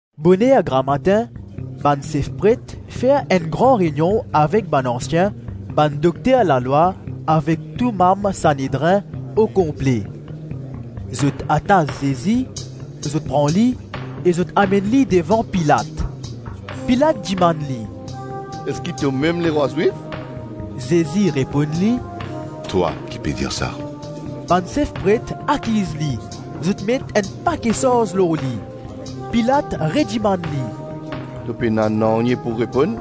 Boner gramatin, bann sef pret fer enn gran reynion avek bann ansien, bann dokter lalwa avek tou manm Sanedrin okonple. Zot atas Zezi, zot pran li e zot amenn li devan Pilat. Pilat dimann li, “Eski tomem lerwa Zwif?” Zezi reponn li, “Twa ki pe dir sa.” Bann sef pret akiz li, zot met enn pake sarz lor li. Pilat redimann li “To pena nanye pou reponn?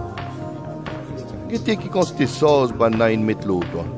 Gete ki kantite sarz bannla inn met lor twa.”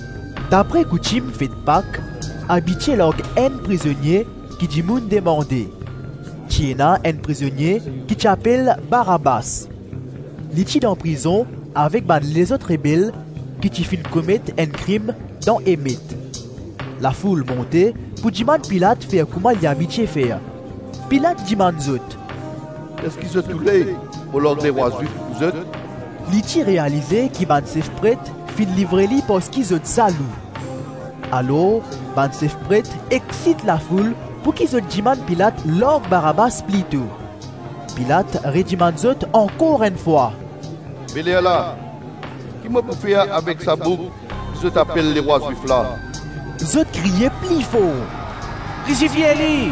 Dapre koutim fet Pak, abitie larg enn prizonie ki dimoun demande. Ti ena enn prizonie ki ti apel Barabas. Li ti dan prizon avek bann lezot rebel ki ti finn komet enn krim dan emet. Lafoul monte pou dimann Pilat fer kouma li abitie fer. Pilat dimann zot, “Eski zot oule mo larg lerwa Zwif pou zot?” Li ti realize ki bann sef pret finn livre li parski zot zalou. Alors bann sef pret exsit lafoul pouki zot dimann Pilat larg Barabas plito. Pilat redimann zot ankor enn fwa, “Be lerla, ki mo pou fer avek sa boug ki zot apel lerwa Zwif la?” Zot kriye pli for, “Krisifie li!”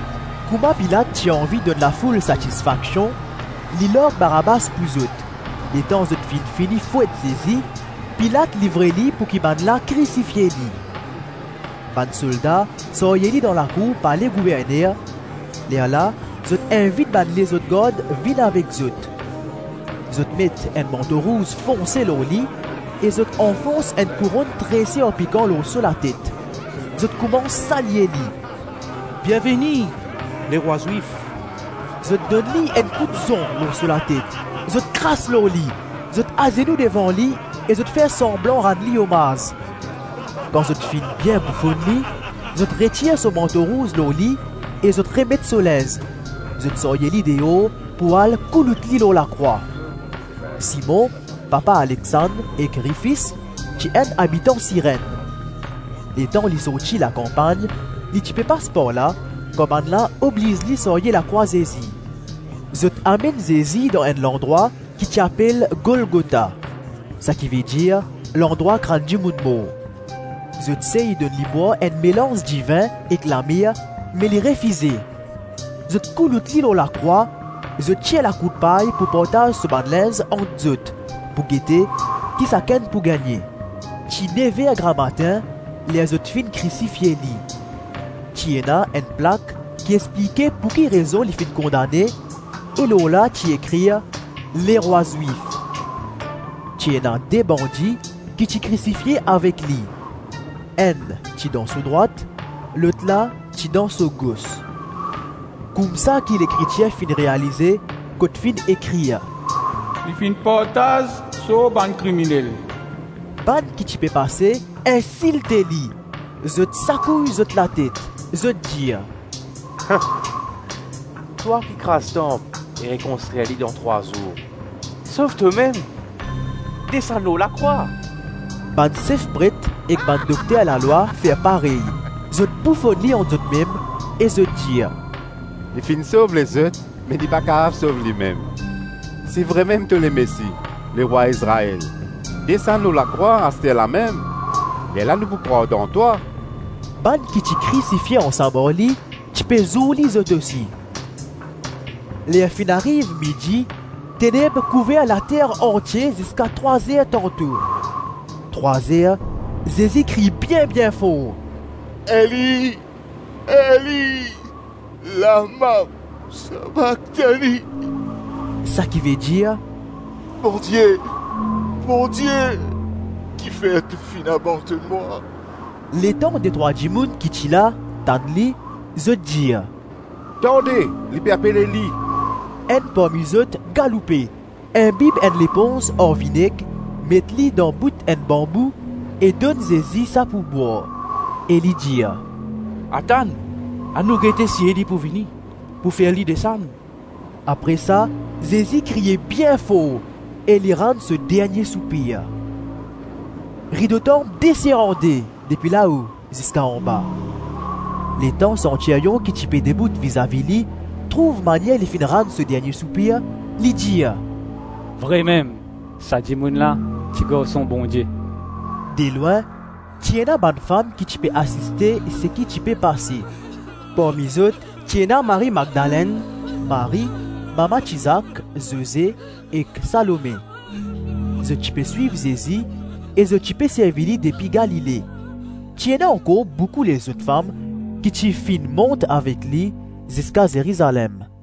Kouma Pilat ti anvi donn lafoul satisfaksion, li larg Barabas pou zot; letan zot finn fini fwet Zezi, Pilat livre li pouki bannla krisifie li. Bann solda sarye li dan lakour pale gouverner; lerla zot invit bann lezot gard vinn avek zot. Zot met enn manto rouz fonse lor li e zot anfons enn kouronn trese ar pikan lor so latet. Zot koumans salye li, “Bienveni, lerwa Zwif.” Zot donn li enn kout zon lor so latet, zot kras lor li, zot azenou devan li e zot fer sanblan rann li omaz. Kan zot finn bien boufonn li, zot retir so manto rouz lor li e zot remet so linz; zot sarye li deor pou al koulout li lor lakrwa. Simon, papa Alexand ek Rifis, ti enn abitan Sirenn. Letan li sorti lakanpagn, li ti pe pas par la, kan bannla obliz li sarye lakrwa Zezi. Zot amenn Zezi dan enn landrwa ki ti apel Golgota, sakivedir Landrwa Krann dimoun mor. Zot sey donn li bwar enn melanz divin ek lamir me li refize. Zot koulout li lor lakrwa; zot tir lakourt-pay pou partaz so bann linz ant zot, pou gete ki sakenn pou gagne. Ti nev-er gramatin ler zot finn krisifie li. Ti ena enn plak ki explike pouki rezon li finn kondane e lor la ti ekrir “Lerwa Zwif.” Ti ena de bandi ki ti krisifie avek li, enn ti dan so drwat, lotla ti dan so gos. [ Koumsa ki Lekritir finn realize kot finn ekrir, “Li finn partaz sor bann kriminel.”] Bann ki ti pe pase insilte li. Zot sakouy zot latet, zot dir, “Twa ki kraz tanp e rekonstrir li dan trwa zour sov tomem, desann lor lakrwa!” Bann sef pret ek bann dokter lalwa fer parey. Zot boufonn li ant zotmem e zot dir, “Li finn sov lezot me li pa kapav sov limem. Si vremem to Lemesi, lerwa Izrael, desann lor lakrwa, asterlamem, lerla nou pou krwar dan twa.” Bann ki ti krisifie ansam ar li, ti pe zour li zot osi. Ler finn ariv midi, teneb kouver later antie ziska trwa-zer tanto. Trwa-zer, Zezi kriy bien-bien for, “Eli, Eli, la-ma sabaktani?” - sakivedir, “Bondie, Bondie, kifer to finn abandonn mwa?” Letan detrwa dimoun ki ti la, tann li, zot dir, “Tande! Li pe apel Eli.” Enn parmi zot galoupe, inbib enn leponz ar vineg, met li dan bout enn banbou e donn Zezi sa pou bwar, e li dir, “Atann, anou gete si Eli pou vini, pou fer li desann.” Apre sa Zezi kriye bien for e li rann so dernie soupir. Rido tanp desir an-de, depi lao ziska anba. Letan santiryon ki ti pe debout vizavi li, trouv manier li finn rann so dernie soupir, li dir, “Vremem, sa dimoun la ti Garson Bondie.” Delwin, ti ena bann fam ki ti pe asiste seki ti pe pase; parmi zot ti ena Marie-Madlenn, Marie, mama ti-Zak, Zoze ek Salome, Zot ti pe swiv Zezi e zot ti pe servi li depi Galile; ti ena ankor boukou lezot fam ki ti finn mont avek li ziska Zerizalem.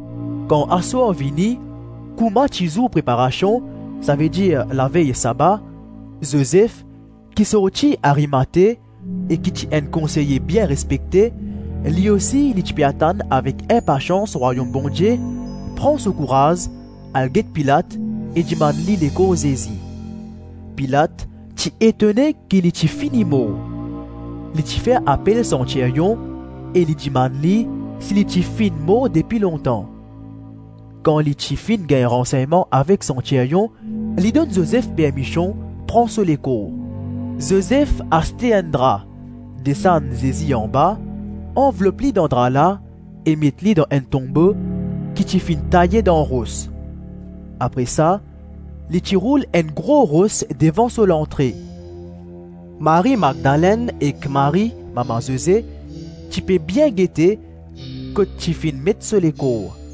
Kan aswar vini, kouma ti zour Preparasion, savedir lavey saba, Zozef ki sorti Arimate e ki ti enn konseye bien respekte, (li osi, li ti pe atann avek inpasians Rwayom Bondie), pran so kouraz, al get Pilat e dimann li lekor Zezi. Pilat ti etone ki li ti fini mor. Li ti fer apel santiryon e li dimann li si li ti finn mor depi lontan. Kan li ti finn gagn ransegnman avek santiryon, li donn Zozef permision pran so lekor. Zozef aste enn dra, desann Zezi anba, anvlop li dan dra la e met li dan enn tonbo ki ti finn taye dan ros; apre sa li ti roul enn gro ros devan so lantre. Marie-Madlenn ek Marie, mama Zoze ti pe bien gete kot ti finn met so lekor.